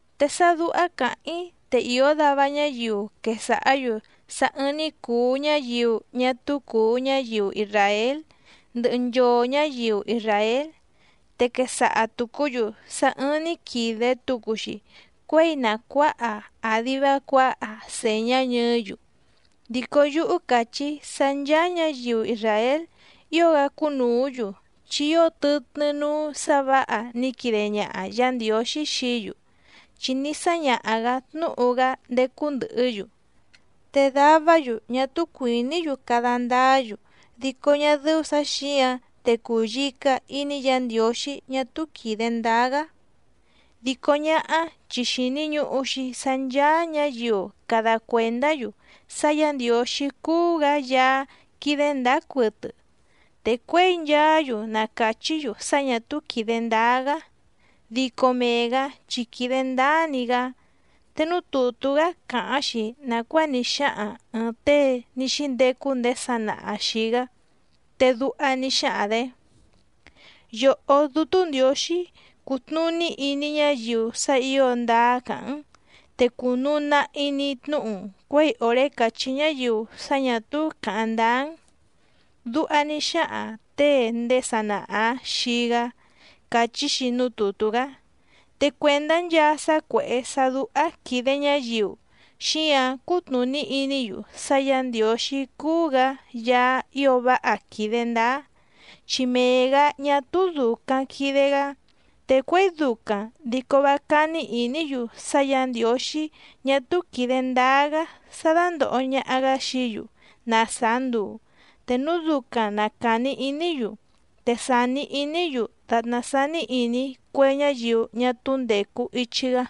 Te sá dúhá càháⁿ‑í te ìó dava ñáyiu quesàhá‑yu sá ɨ́ɨ́ⁿ‑ní cùu ñáyiu ñá túú cùu ñáyiu isràél ndɨhɨ nchoo ñǎyiu isràél, te quesaha tùcú‑yu sá ɨ́ɨ́ⁿ‑ní quìde tucu‑xi cuéi na cuǎha àdi vá cuǎha sèñá ñɨɨ́‑yu. Dico yúhú càchí‑í sá ncháá ñǎyiu isràél ío‑gá cúnùú‑yu, chi ío tɨtnɨ́ núú sǎ vǎha ní quide ñaha Yǎ Ndiǒxí xií‑yu, chi ní sáñaha‑gǎ tnúhu‑gá ndécú ndɨ̀hɨ́‑yu. Te davá‑yu ñá túú cuìní‑yu cada ndáá‑yu, dico ñá dɨ́ú sǎ xǐǎⁿ te cùyica iní Yǎ Ndiǒxí ñá túú quìde ndáá‑gá. Dico ñáhá chi xìni ñuhu‑xi sá ncháá ñǎyiu cada cuèndá‑yu sá Yǎ Ndiǒxí cúú‑gǎ Yaá quídé ndǎá cuɨtɨ, te cuěi nchaá‑yu na càchí‑yu sá ñà túú quìde ndáá‑gá, dico mee‑gǎ chi quìde ndáá‑ni‑gá. Te núú tùtú‑gá càháⁿ‑xi nàcuáa ní xáhaⁿ ɨ̀ɨⁿ tée ní xíndecu ndéé sanaha xìi‑gá, te duha ní xáhaⁿ‑dě: Yòhó Dútú Ndiǒxí, cùtnuní iní ñáyiu sá ǐo ndáá càháⁿ‑n, te cùnuu nahi‑ni tnúhu‑n cuěi òré càchí ñáyiu sá ñà túú càháⁿ ndáá‑n. Duha ní xáhaⁿ těe ndéé sanaha‑ǎⁿ xii‑gá càchí‑xi núú tùtú‑gá. Te cuèndá nchaa sá cuèhé sá dúhá quìde ñáyiu, xíǎⁿ cútnùní iní‑yu sá Yǎ Ndiǒxí cúú‑gǎ Yaá ío váha quìde ndáá, chi mee‑gǎ ñá túú dùcaⁿ quide‑gá. Te cuěi ducaⁿ dico vá cání ìní‑yu sá Yǎ Ndiǒxí ñá túú quìde ndáá‑gá sá dándòho ñaha‑gá xií‑yu na sàá nduu, te núu ducaⁿ na càni iní‑yu, te sàni iní‑yu dàtná sání ìní cue ñáyiu ñá túú ndècu ichi‑gá.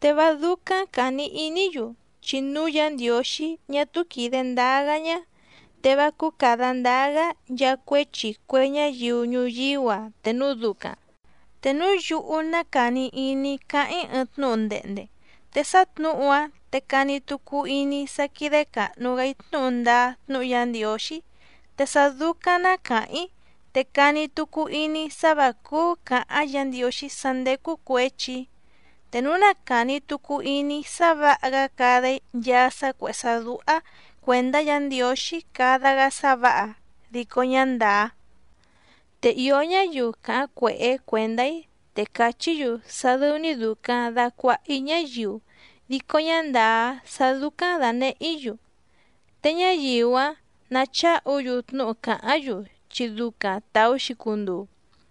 Te vá dúcáⁿ càni iní‑yu, chi núu Yá Ndiǒxí ñá túú quìde ndáá‑gá ñá, te vá cúú càda ndáá‑gá nchaa cuéchi cue ñáyiu ñuyíú‑a te núu ducaⁿ. Te núu yúhú ná càni iní‑í cáháⁿ‑í ɨɨⁿ tnúhu ndehnde, te sá tnǔhu‑áⁿ te cani tucu iní‑í sá quídé càhnu‑gá‑í tnúhu ndáá tnúhu Yá Ndiǒxí, te sá dúcáⁿ ná càháⁿ‑í te cani tucu iní‑í sá vǎ cúú cǎháⁿ Yǎ Ndiǒxí sá ndécú cuěchi‑í. Te núu na càni tucu iní‑í sá vǎha‑gá cada‑í nchaa sá cuèhé sá dúhá cuèndá Yǎ Ndiǒxí cada‑gá sá vǎha, dico ñá ndàá. Te ìó ñáyiu càháⁿ cuèhé cuèndá‑í te càchí‑yu sá dɨ́ú‑ní dùcaⁿ dacuaha‑í ñáyiu dico ñá ndàá sá dúcáⁿ dànehé‑í‑yu, te ñáyiu‑áⁿ nacháhu‑yu tnúhu càháⁿ‑yu, chi ducaⁿ tàú‑xi cunduu.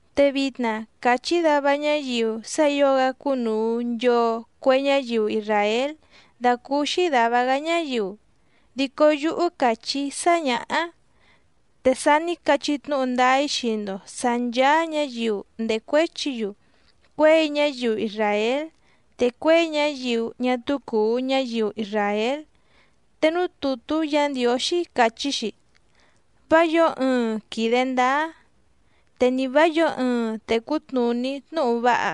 Te vitna càchí dava ñáyiu sá ǐo‑gá cúnùu nchoo cue ñáyiu isràél dàcúúxí dàva‑gá ñáyiu, dico yúhú càchí‑í sá ñǎhá, te sa ní cachí tnúhu ndáá‑í xii‑ndo sǎ nchàa ñáyiu ndècuéchi‑yu cuěi ñáyiu isràél te cuěi ñáyiu ñá túú cùu ñáyiu isràél. Te núú tùtú Yǎ Ndiǒxí càchí‑xi: Vá yǒo ɨɨⁿ quìde ndáá, te ni vá yǒo ɨɨⁿ tècú tnùní tnúhu váha,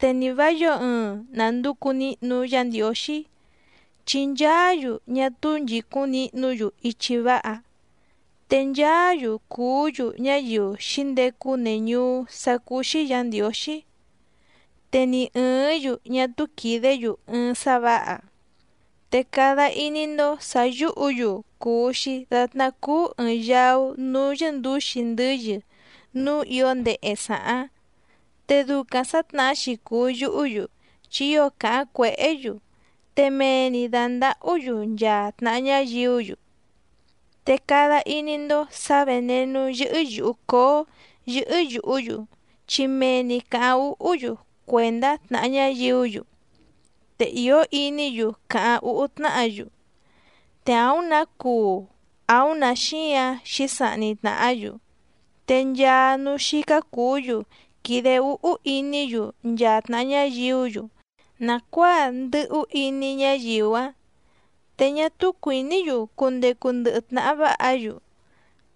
te ni vá yǒo ɨɨⁿ nànducu nihnu Yá Ndiǒxí. Chi nchaá‑yu ñá túú nchìcúⁿ nihnú‑yu ichi váha, te nchaá‑yu cùú‑yu ñáyiu xǐndecu neñùú sá cúú‑xí Yǎ Ndiǒxí. Te ni ɨ̀ɨ́ⁿ‑yu ñá túú quìdé‑yu ɨɨⁿ sá vǎha. Te cada iní‑ndó sǎ yúhǔ‑yu cùu‑xi datná cúú ɨ̀ɨⁿ yaú núú yɨ́ndǔxi ndɨ́yɨ núú ǐo ndehe sàháⁿ, te ducaⁿ sǎtnahá‑xi cùu yuhú‑yu, chi ío càháⁿ cuèhé‑yu, te mee‑ni dàndahú‑yu nchaa tnàha ñáyiú‑yu. Te cada iní‑ndó sǎ vènenú cóó yɨ́hɨ́ yùhú‑yu chi mee‑ni càháⁿ úhú‑yu cuèndá tnàha ñáyiú‑yu. Te ìó iní‑yu càháⁿ úhú tnáhǎ‑yu. Te àúⁿ nǎ cuu àúⁿ nǎ xíǎⁿ xǐsahni tnàhá‑yu. Te nchaa núú xícá cùú‑yu quìde úhú iní‑yu nchaa tnàha ñáyiú‑yu nàcuáa ndɨ̀hú iní ñáyiu‑áⁿ. Te ñá túú cuìní‑yu cundecu ndɨhɨ tnàha váha‑yu.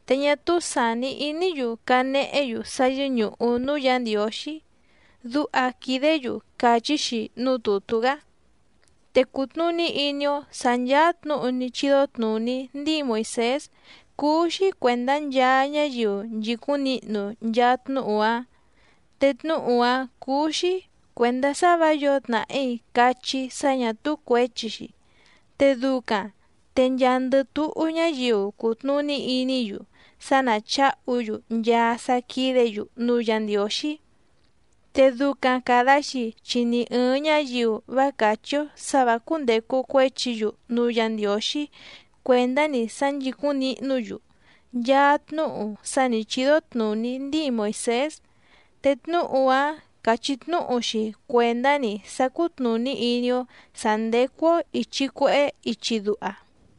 Te ñá túú sàni iní‑yu canehé‑yu sá yɨ́ñùhu núú Yǎ Ndiǒxí. Duha quìdé‑yu càchí‑xi núú tùtú‑gá. Te cùtnuní iní‑ó sǎ nchàa tnúhu ní chídó tnùní ndíi Moìsés cúú‑xí cuèndá nchaa ñáyiu nchìcúⁿ nihnu nchaa tnúhu‑áⁿ. Te tnúhu‑áⁿ cúú‑xí cuèndá sá vǎ yǒo tnàhí cachí sá ñà túú cuěchi‑xi, te ducaⁿ te nchaandɨ túhú ñáyiu cutnùní iní‑yu sá ná chǎhu‑yu nchaa sá quídě‑yu núú Yǎ Ndiǒxí. Te ducaⁿ càda‑xi chi ni ɨ̀ɨⁿ ñáyiu vá càchí‑ó sǎ vǎ cúndècu cuéchi‑yu núú Yǎ Ndiǒxí cuèndá‑ni sá nchìcúⁿ nihnú‑yu nchaa tnúhu sá nǐ chídó tnùní ndíi Moìsés, te tnúhu‑áⁿ càchí tnúhu‑xi cuèndá‑ni sá cútnùní iní‑ó sǎ ndécú‑ó ìchi cuehé ichi duha.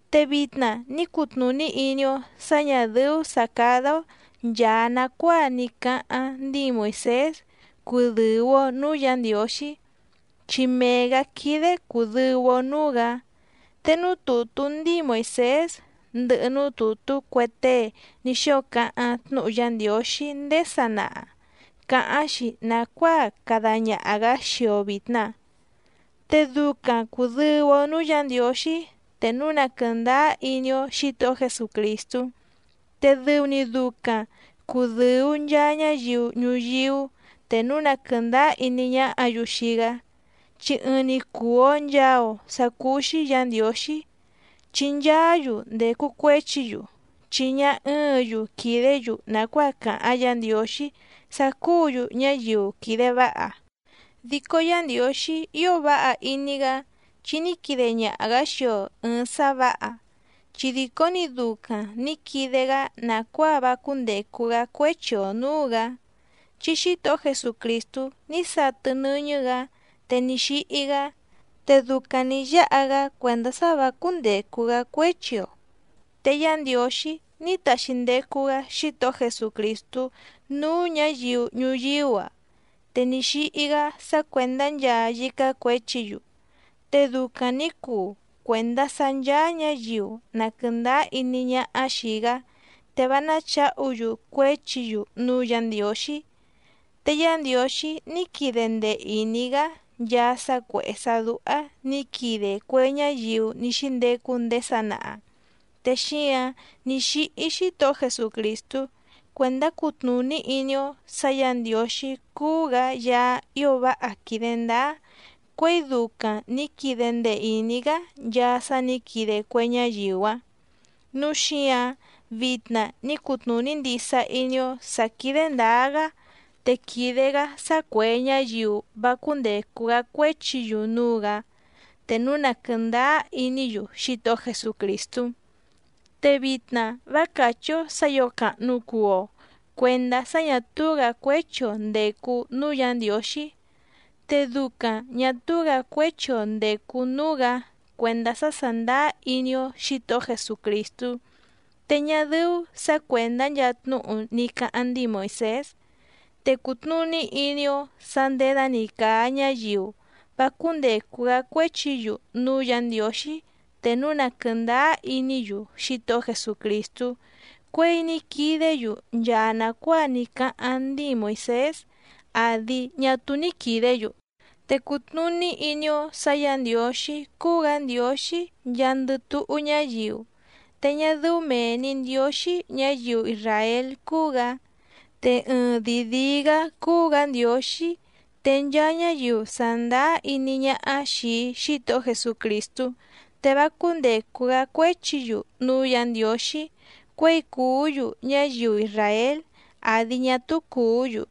Te vitna ní cutnùní iní‑ó sǎ ñà dɨ́ú sǎ cádá‑ó nchàa nacuáa ní cáháⁿ ndíi Moìsés cudɨ̀u‑o núú Yǎ Ndiǒxí, chi mee‑gǎ quídé cùdɨu‑o núú‑gǎ. Te núú tùtú ndíi Moìsés ndɨhɨ núú tùtú cue tée ní xóo cáháⁿ tnúhu Yá Ndiǒxí ndéé sanaha càháⁿ‑xi nàcuáa cada ñaha‑gǎ xii‑o vìtna. Te ducaⁿ cùdɨu‑o núú Yǎ Ndiǒxí te núu na quɨ̀ndáá iní‑ó Xǐtohó Jesucrìstú. Te dɨu‑ni ducaⁿ cùdɨu nchaa ñáyiu ñuyíú te núu na quɨ̀ndáá iní ñáhǎ‑yu xii‑gá, chi ɨɨⁿ‑ni cùu‑o nchaa‑o sá cúú‑xí Yǎ Ndiǒxí. Chi nchaá‑yu ndècu cuéchi‑yu, chi ñá ɨ́ɨ̌ⁿ‑yu quìdé‑yu nàcuáa cáháⁿ Yǎ Ndiǒxí sá cúǔ‑yu ñáyiu quìde váha. Dico Yá Ndiǒxí ío váha iní‑gá chi ní quide ñaha‑gǎ xii‑o ɨ̀ɨⁿ sá vǎha, chi dìcó‑ni ducaⁿ nǐ quide‑gá nàcuáa vá cúndècu‑gá cuéchi‑o nǔú‑gǎ, chi Xítohó Jesucrìstú ní satɨ nɨ́ñɨ́‑gǎ te ní xíhí‑gá, te ducaⁿ nǐ yáha‑gá cuèndá sá vǎ cúndècu‑gá cuéchi‑o. Te Yá Ndiǒxí ní taxi ndecu‑gá Xítohó Jesucrìstú núú ñǎyiu ñuyíú‑a, te ní xíhí‑gá sá cuèndá nchaa yícá cuěchi‑yu, te ducaⁿ nǐ cuu cuèndá sá ncháá ñǎyiu na quɨ̀ndáá iní ñáhá xìi‑gá te vá náchǎhu‑yu cuéchi‑yu núú Yǎ Ndiǒxí. Te Yá Ndiǒxí ní quide ndee ìní‑gá nchaa sá cuèhé sá dúhá nǐ quide cue ñáyiu ní xíndecu ndéé sanaha. Te xíǎⁿ ní xíhí Xítohó Jesucrìstú cuèndá cutnùní iní‑ó sǎ Yǎ Ndiǒxí cúú‑gǎ Yaá ío váha quìde ndáá cuěi ducaⁿ nǐ quide ndee ìní‑gá nchaa sá nǐ quide cue ñáyiu‑áⁿ. Núu xíǎⁿ vitna ní cutnùní ndisa iní‑ó sǎ quídé ndǎá‑gá, te quìde‑gá sá cuè ñáyiu vá cúndècu‑gá cuéchi‑yu núú‑gǎ, te núu na quɨ̀ndáá iní‑yu Xítohó Jesucrìstú. Te vitna vá càchí‑ó sǎ ǐo càhnu cuu‑o cuendá sá ñà túú‑gǎ cuéchi‑o ndècu núú Yǎ Ndiǒxí, te ducaⁿ ñà túú‑gǎ cuéchi‑o ndècu núú‑gǎ cuèndá sá sàndáá iní‑ó Xǐtohó Jesucrìstú, te ñá dɨ́ú sǎ cuèndá nchaa tnúhu ní cáháⁿ ndíi Moìsés. Te cùtnuní iní‑ó sǎ nděda‑ni càa ñáyiu vá cúndècu‑gá cuéchi‑yu núú Yǎ Ndiǒxí te núu na quɨ̀ndáá iní‑yu Xítohó Jesucrìstú cuěi ní quidé‑yu nchaa nàcuáa ní cáháⁿ ndíi Moìsés àdi ñá túú ní quìdé‑yu. Te cùtnuní iní‑ó sǎ Yǎ Ndiǒxí cúú‑gǎ Ndiǒxí nchaandɨ túhú ñáyiu, te ñá dɨ́ú mèe‑ni Ndióxí ñǎyiu isràél cúú‑gǎ. Te ɨɨⁿdìi díí‑gǎ cúú‑gǎ Ndiǒxí, te nchaa ñáyiu sàndáá iní ñáhá xìi Xítohó Jesucrìstú te vá cúndècu‑gá cuéchi‑yu núú Yǎ Ndiǒxí cuěi cùú‑yu ñáyiu isràél àdi ñá túú cùú‑yu.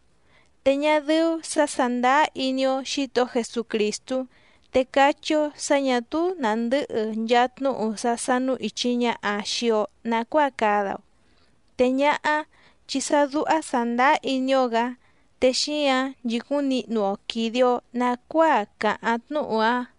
Te ñá dɨ́ú sǎ sàndáá iní‑ó Xǐtohó Jesucrìstú te cachí‑ó sǎ ñà túú nàndɨ́hɨ nchaa tnúhu sá sánú ìchi ñaha xii‑o nacuáa cada‑o, te ñáhá chi sá dúhá sàndáá iní‑ó‑gǎ te xíǎⁿ nchìcúⁿ nihnu‑o quìde‑o nacuáa càháⁿ tnúhu‑áⁿ.